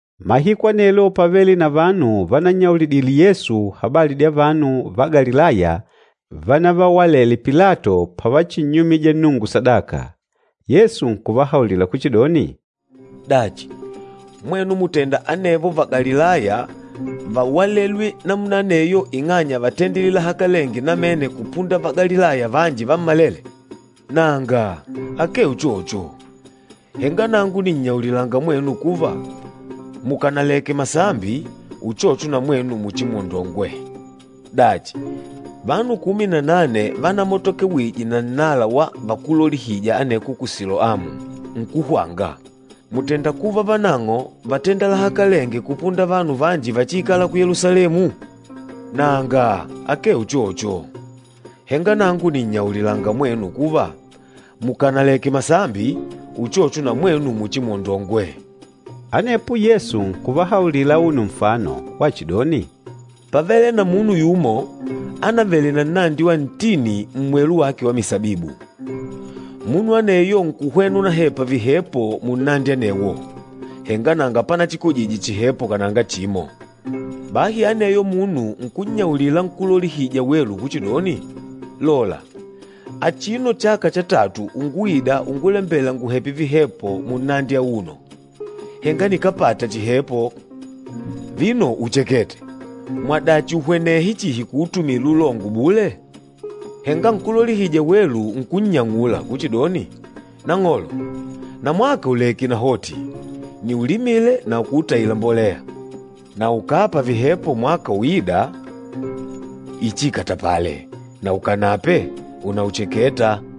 Mahiku anelo pávele na vanu vanannyaulidile Yesu habali dya vanu va Galilaya vanavawalele Pilato pavachinnyumija Nnungu sadaka. Yesu nkuvahaulila kuchidoni, “Dachi, mwenu mùtenda anevo Vagalilaya váwalelwe namuna aneyo ing'anya vátenda lahakalenge namene kupunda Vagalilaya vanji vammalele? Nanga, akee uchocho! Henga nangu nìnnyaulilanga mwenu kuva, mukanaleke masambi, uchocho na mwenu muchimwondongwe. Dachi, vanu kumi na nane vanamatokewije na nnala wa vakúlolihija aneko ku Siloamu, nkuhwanga, mùtenda kuva vanang'o vátenda lahakalenge kupunda vanu vanji váchiikala ku Yelusalemu? Nanga, akee uchocho! Henga nangu nìnnyaulilanga mwenu kuva, mukànaleke masambi, uchocho na mwenu muchimwondongwe.” Anepo Yesu nkuvahaulila auno nfano wachidoni, “Pávele na munu yumo ánavele na nnandi wa ntini mmwelu wake wa misabibu. Munu aneyo nkuhwena unahepa vihepo munnandi anewo, henga nanga panachikojije chihepo kananga chimo. Bahi aneyo munu nkunnyaulila nkúlolihija welu kuchidoni, ‘Lola, achino chaka cha tatu unguida ungulembela nguhepe vihepo munnandi auno, henga nikápata chihepo. Vino uchekete! Mwadachi uhwenehe chihi kuutumila ulongo bule?’ Henga nkúlolihija welu nkunnyang'ula kuchidoni, ‘Nang'olo, namwaka uleke nahoti, niulimile na kuutaila mbolea. Na ukàpa vihepo mwaka uîda, ichiikatapale, na ukanape unaucheketa.’”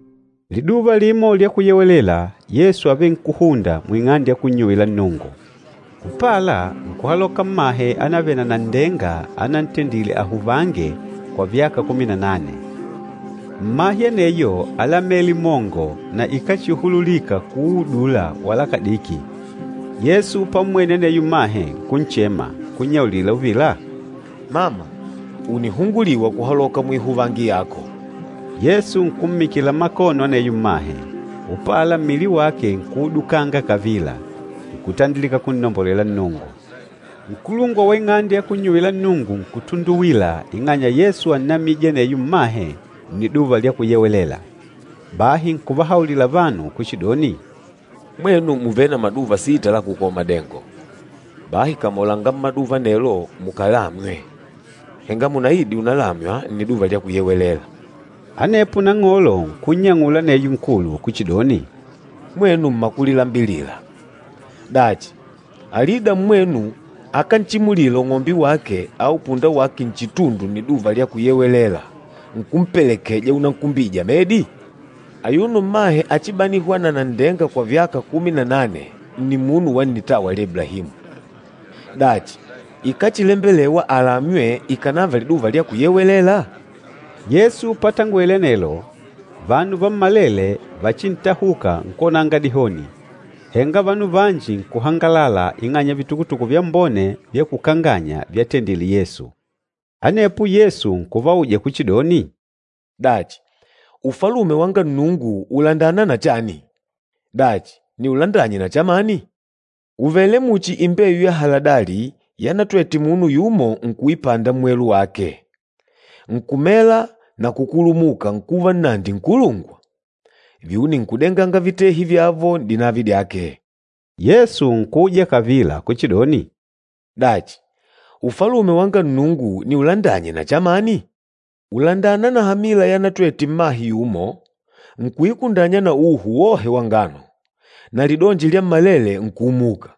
Liduva limo lya Kuyewelela, Yesu ávenkuhunda muing'ande ya kunnyuwila Nnungu. Upala, nkuhaloka mmahe anavele na nanndenga anantendile ahuvange kwa vyaka kumi na nane. Mmahe aneyo álamele mongo na ikáchihululika kuudula wala kadiki. Yesu pammwene aneyo mmahe, nkunchema, nkunnyaulila uvila, “Mama, ùnihunguliwa kuhaloka muihuvangi yako!” Yesu nkummikila makono aneyo mmahe, upala mmili wake nkuudukanga kavila, nkutandilika kunnombolela Nnungu. Nkulungwa wa ing'ande ya kunnyuwila Nnungu nkutunduwila ing'anya Yesu ánnamije aneyo mmahe Nniduva lya Kuyewelela. Bahi nkuvahaulila vanu kuchidoni, “Mwenu mùvele na maduva sita la kukola madengo. Bahi kamolanga mmaduva anelo mukalamywe, henga munaide unalamywa Nniduva lya Kuyewelela.” Anepo Nang'olo nkunnyang'ula aneyo nkulu kuchidoni, “Mwenu mmakulilambilila! Dachi, alida mmwenu akánchimulila ung'ombe wake au punda wake nchitundu Nniduva lya Kuyewelela nkumpelekeja unankumbija medi? Ayuno mmahe achibanîhwa na nanndenga kwa myaka kumi na nane nni munu wa nnitawa lya Iblahimu, dachi ikáchilembelewa alamywe ikànava Liduva lya Kuyewelela?” Yesu patangwele anelo, vanu vammalele vachintahuka nkwonanga dihoni, henga vanu vanji nkuhangalala ing'anya ya vitukutuku vyambone vya kukanganya vyatendile Yesu. Anepo Yesu nkuvauja kuchidoni, “Dachi, Ufalume wanga Nnungu ùlandana na chani? Dachi, niulandanye na chamani? Ùvele muchi imbeyu ya haladali yanatwete munu yumo nkuipanda mmwelu wake, nkumela na kukulumuka nkuva nnandi nkulungwa. Vyuni nkudenganga vitehi vyavo n'dinavi dyake.” Yesu nkuuja kavila kuchidoni, “Dachi, Ufalume wanga Nnungu niulandanye na chamani? Ùlandana na hamila yanatwete mmahe yumo, nkuikundanya na uhu wohe wa ngano, na lidonji lyammalele nkuumuka.”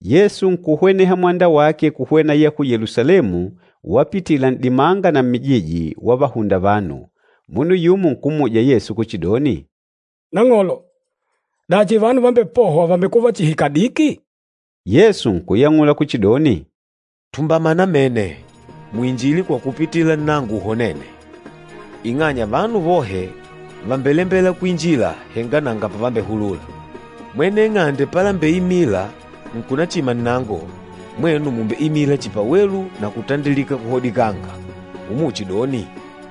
Yesu nkuhweneha mwanda wake kuhwena ya ku Yelusalemu wapitila n'dimanga na mmijiji, wavahunda vanu. Munu yumo nkummuja Yesu kuchidoni, “Nang'olo, dachi vanu vambepôhwa vàmbekuva chihi kadiki?” Yesu nkuyang'ula kuchidoni, “Tumbama namene, muinjilile kwa kupitila nnango uhonêne, ing'anya vanu vohe vàmbelembela kwinjila, henga nanga pavambehulula. Mwene ing'ande palembeimila nkunachima nnango, mwenu mùmbeimila chihi pawelu na kutandilika kuhodikanga, umuchidoni,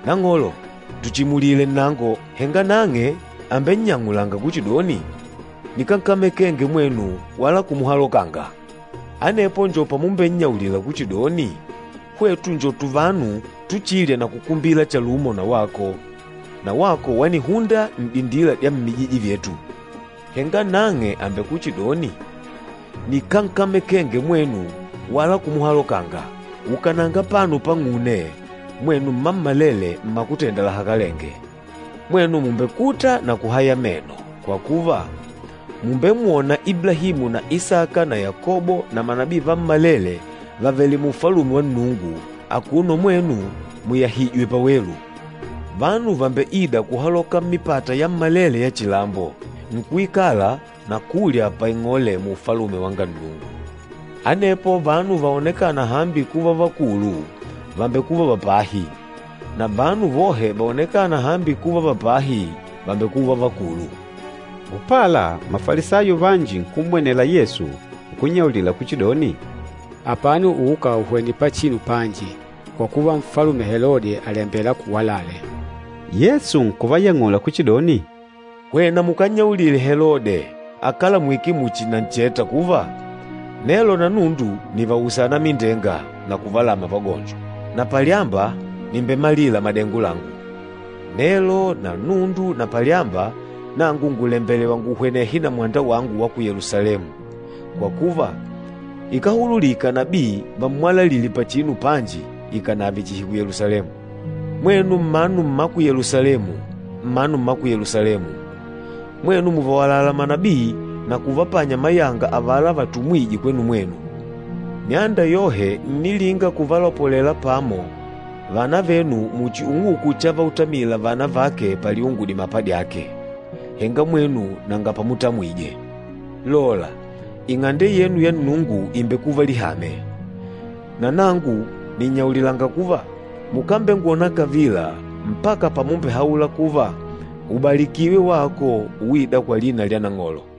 ‘Nang'olo, tuchimulile nnango.’ Henga nang'e àmbennyang'ula kuchidoni, ‘Nikánkamekenge mwenu wala kumuhalokanga!’ Anepo njo pamumbennyaulila kuchidoni, ‘Hwetu njo tuvanu tuchilya na kukumbila chalumo na wako, na wako wanihunda n'dindila dya mmijiji vyetu.’ Henga nang'e àmbekuchidoni, ‘Nikánkamekenge mwenu wala kumuhalokanga! Ukananga apano pang'une, mwenu mmammalele mmakutenda lahakalenge!’ Mwenu mùmbekuta na kuhaya meno, kwa kuva, mùmbemwona Iblahimu na Isaka na Yakobo na manabii vammalele vavèlè mu Ufalume wa Nnungu, akuno mwenu muyahìjwè pawelu! Vanu vàmbeida kuhaloka mmipata yammalele ya chilambo, nkuikala na kulya paing'ole mu Ufalume wanga Nnungu. Anepo vanu vaonekâna hambi kuva vakulu, vàmbekuva va pahi, na vanu vohe vaonekâna hambi kuva va pahi, vàmbekuva vakulu.” Upala, Mafalisayo vanji nkummwenela Yesu nkunnyaulila kuchidoni, “Apano uka uhwene pachinu panji, kwa kuva Nfalume Helode àlembela akuwalale.” Yesu nkuvayang'ula kuchidoni, “Hwena mukannyaulile Helode, akalamwîke muchi nancheta kuva, ‘Nelo na nundu nìvausa anamindenga na kuvalamya vagonjo, na palyamba nìmbemalila madengo langu.’ Nelo na nundu na palyamba, nangu ngùlembelewa nguhwenehe na mwanda wangu wa ku Yelusalemu, kwa kuva, ikáhululika nabii vammwalalile pachinu panji ikànave chihi ku Yelusalemu. Mwenu mmanu mma ku Yelusalemu, mmanu mma ku Yelusalemu! Mwenu mùvawalala manabii na kuvapanya mayanga avala vatumwîje kwenu mwenu. Myanda yohe ǹnilinga kuvalopolela pamo vana venu muchi ung'uku chavautamila vana vake paliungu dimapa dyake, henga mwenu nanga pamutamwije. Lola, Ing'ande yenu ya Nnungu ìmbekuva lihame. Na nangu nìnnyaulilanga kuva, mukambengwona kavila mpaka pamumbehaula kuva, ‘Ubalikiwe wako uîda kwa lina lya Nang'olo.’”